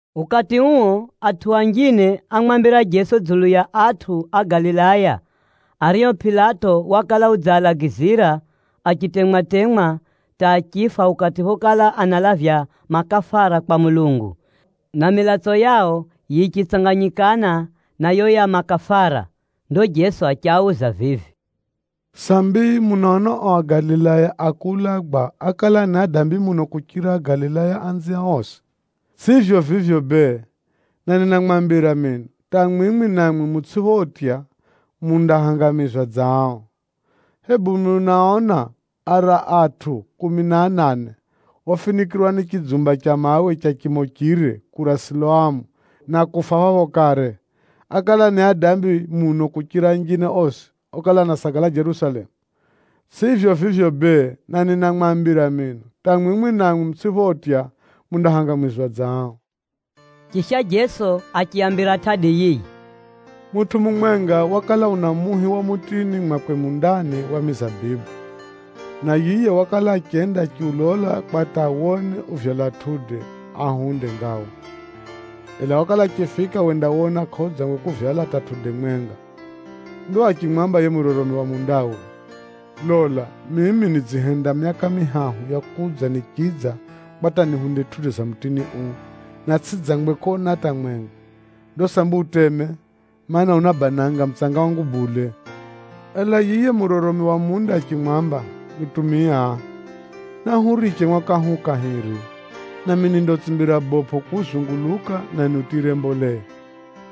Ukati uo atʼu anjine ámwambira Jeso dzulu ya atʼu a Galilaya ario Pilato wakala udzialagizira achitemwa-temwa hata achifa ukati phokala analavya makafara kwa Mulungu, na milatso yao yichitsanganyikana na yo ya makafara. Ndo Jeso achiauza vivi, “Sambi munaona o Agalilaya a kuulagwa ákala ni adambi muno kuchira Agalilaya anziao osi? Tsʼivyo vivyo bee, na ninamwambira mino, hata mwimwi namwi mutsʼiphotya, mundahangamizwa dza ao. Hebu munaona ara atʼu kumi na anane ofinikʼirwa ni chidzumba cha mawe cha chimo chire kura Siloamu na kufa phapho kare, ákala ni adambi muno kuchira anjine osi okala anasagala Jerusalemu? Tsʼivyo vivyo bee, na ninamwambira mino, hata mwimwi namwi mutsʼiphotya, mundahangamizwa dza ao.” Chisha Jeso achiaambira tʼadi yiyi: “Mutʼu mumwenga wakala una muhi wa mutini mwakwe mundani wa mizabibu, na yiye wakala achenda achiulola kwa hata awone uvyala matunda ahunde ngawa, ela wakala achifika wendawona kʼaudzangwe kuvyala hata matunda mwenga. Ndo achimwamba yiye muroromi wa mundawe, ‘Lola, mimi nidzihenda myaka mihahu ya kudza nichidza kwa hata nihunde matunda ga mutini uu, na tsʼidzangwe kona hata mwenga. Ndo sambi uteme, mana, unabananga mutsanga wangu bule.’ Ela yiye muroromi wa munda achimwamba, ‘Mutumia, nahuuriche mwaka uu kahiri, nami nindautsimbira bopʼo kuzunguluka na niutiyire mboleya.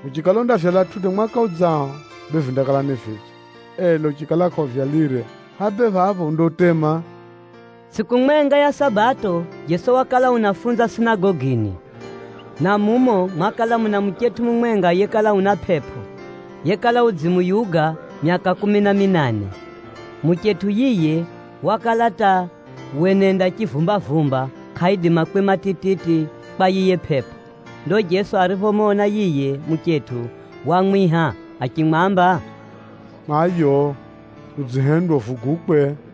Uchikala undavyala matunda mwaka udzao, bee vindakala ni vidzo, ela uchikala kʼauvyalire, hʼa bee phapho undautema.’” Tsʼiku mwenga ya Sabato Jeso wakala unafunza sinagogini, na mumo mwakala muna muchetʼu mumwenga yekala una pʼepʼo, yekala udzimuyuga myaka kumi na minane. Muchetʼu yiye wakala hata wenenda chivumbavumba kʼaidima kwima tititi kwa yiye pʼepʼo. Ndo Jeso ariphomona yiye muchetʼu, wamwiha achimwamba, “Mayo, udzihendwa uvugukwe.”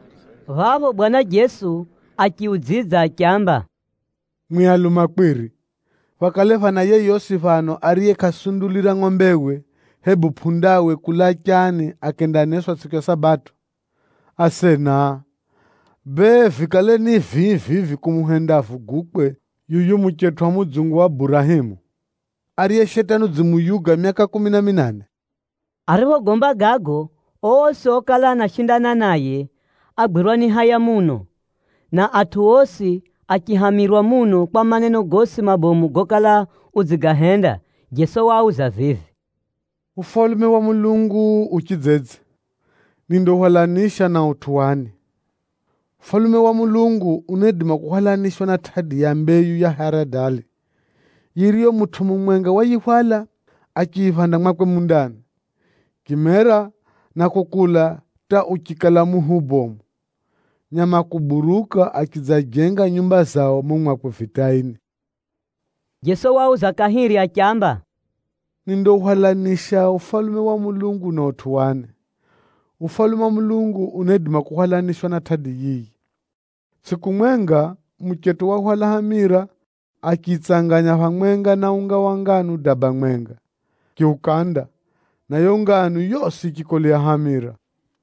Phapho Bwana Jeso achiudzidza achiamba, “Mwi alumakwiri! Phakale phana yeyosi phano ariye kʼasundulira ngʼombewe, hebu pʼundawe kulaa chaani akendaneswa tsʼiku ya Sabato? Asena! Bee, vikale ni vii vivi kumuhenda avugukwe tsʼiku ya Sabato yuyu muchetʼu wa mudzungu wa Burahemu, ariye Shetani udzimuyuga myaka kumi na minane?” Ariphogomba gago, osi okala anashindana naye ágwirwa ni haya muno, na atʼu osi achihamirwa muno kwa maneno gosi mabomu gokala udzigahenda. Jeso wauza vivi, “Ufalume wa Mulungu u chidzedze? Nindauhwalanisha na utʼu wani? Ufalume wa Mulungu unaidima kuhwalanishwa na tʼadi ya mbeyu ya haradali yiriyo mutʼu mumwenga wayihwala achiyiphanda mwakwe mundani, yichimera na kukula hata uchikala muhi ubomu. Nyama a kuburuka achidzajenga nyumba zao mumo mwakwe vitaini.” Jeso wauza kahiri achiamba, “Nindauhwalanisha Ufalume wa Mulungu na utʼu wani? Ufalume wa Mulungu unaidima kuhwalanishwa na tʼadi yiyi. Tsʼiku mwenga, muchetʼu wahwala hamira achiyitsanganya phamwenga na unga wa nganu daba mwenga, achiukanda, na yiyo nganu yosi yichikolea hamira.”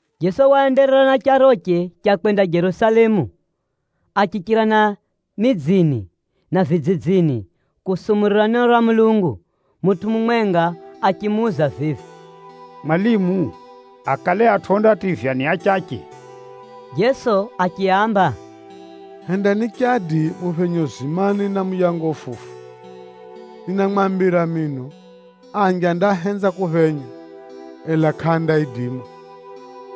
Jeso waenderera na charoche cha kwenda Jerusalemu, achichira na midzini na vidzidzini kusumurira neno ra Mulungu. Mutʼu mumwenga achimuuza vivi, “Mwalimu, akale atʼu ondativywa ni achache?” Jeso achiaamba, “Hendani chadi muphenye uzimani na muyango ufufu. Ninamwambira mino, anji andahenza kuphenya, ela kʼaandaidima.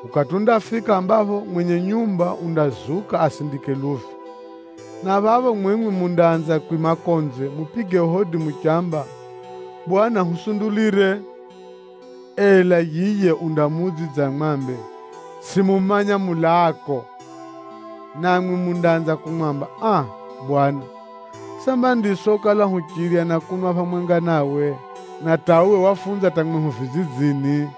“Ukati undafika ambapho mwenye nyumba undazuka asindike luvi, na phapho mwimwi mundaanza kwima konze mupige hodi muchamba, ‘Bwana, husundulire!’ undamuudzidza amwambe, ‘Tsʼimumanya mulaako mwimwi.’ Namwi mundaanza kumwamba, ‘Aa! Bwana, samba ndiswi okala huchirya na kunwa phamwenga nawe, na hata uwe wafunza hata mwehu vidzidzini.’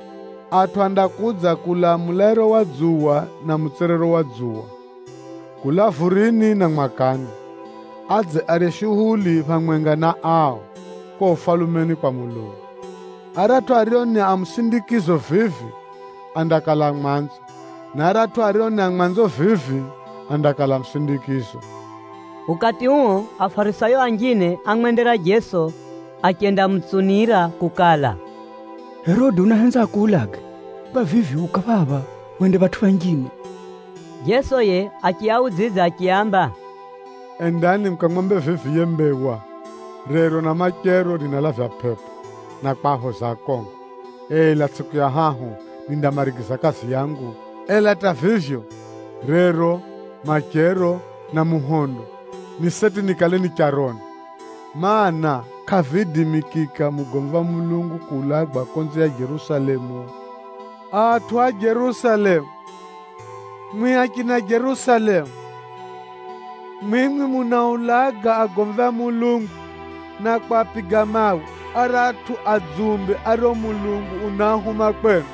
Atʼu andakudza kulaa mulairo wa dzuwa na mutswerero wa dzuwa, kulaa vurini na mwakani, adze arye shuhuli phamwenga na ao, kuko Ufalumeni kwa Mulungu. Aratʼu ario ni a musindikizo vivi, andakala a mwanzo, na aratʼu ario ni a mwanzo vivi, andakala a musindikizo.” Ukati uo, Afarisayo anjine ámwendera Jeso achendamutsunira kukala, “Herode unahenza akuulage, kwa vivyo, uka phapha wende phatʼu phanjine.” Jeso yiye achiaudzidza achiaamba, “Endani mukamwambe vivi yiye mbewa, ‘Rero na machero ninalavya pʼepʼo na kwaphoza akongo, ela tsʼiku ya hahu, nindamarigiza kazi yangu.’ Ela hata vivyo, rero, machero na muhondo ni seti nikale ni charoni, mana, kʼaviidimikika mugomvi wa Mulungu kuulagwa konze ya Jerusalemu! “Atʼu a Jerusalemu! Mwimwi achina Jerusalemu! Mwimwi munaaulaga agomvi a Mulungu na kwapiga mawe aratʼu adzumbe ario Mulungu unaahuma kwenu!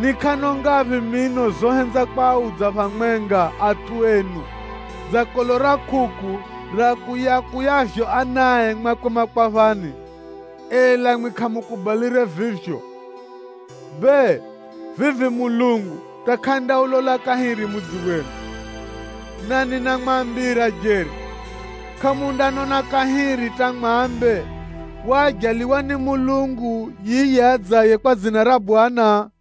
Ni kʼano ngaphi mino zohenza kwaudza phamwenga atʼu enu dza kolo ra kʼukʼu riakuyakuyavyo anae mwakwe makwaphani, ela mwimwi kʼamukubalire vivyo. Bee, vivi Mulungu hata kʼandaulola kahiri mudzi wenu. Na ninamwambira jeri, kʼamundanona kahiri hata mwambe, ‘Waajaliwa ni Mwenyezi Mulungu yiye adzaye kwa dzina ra Bwana!’”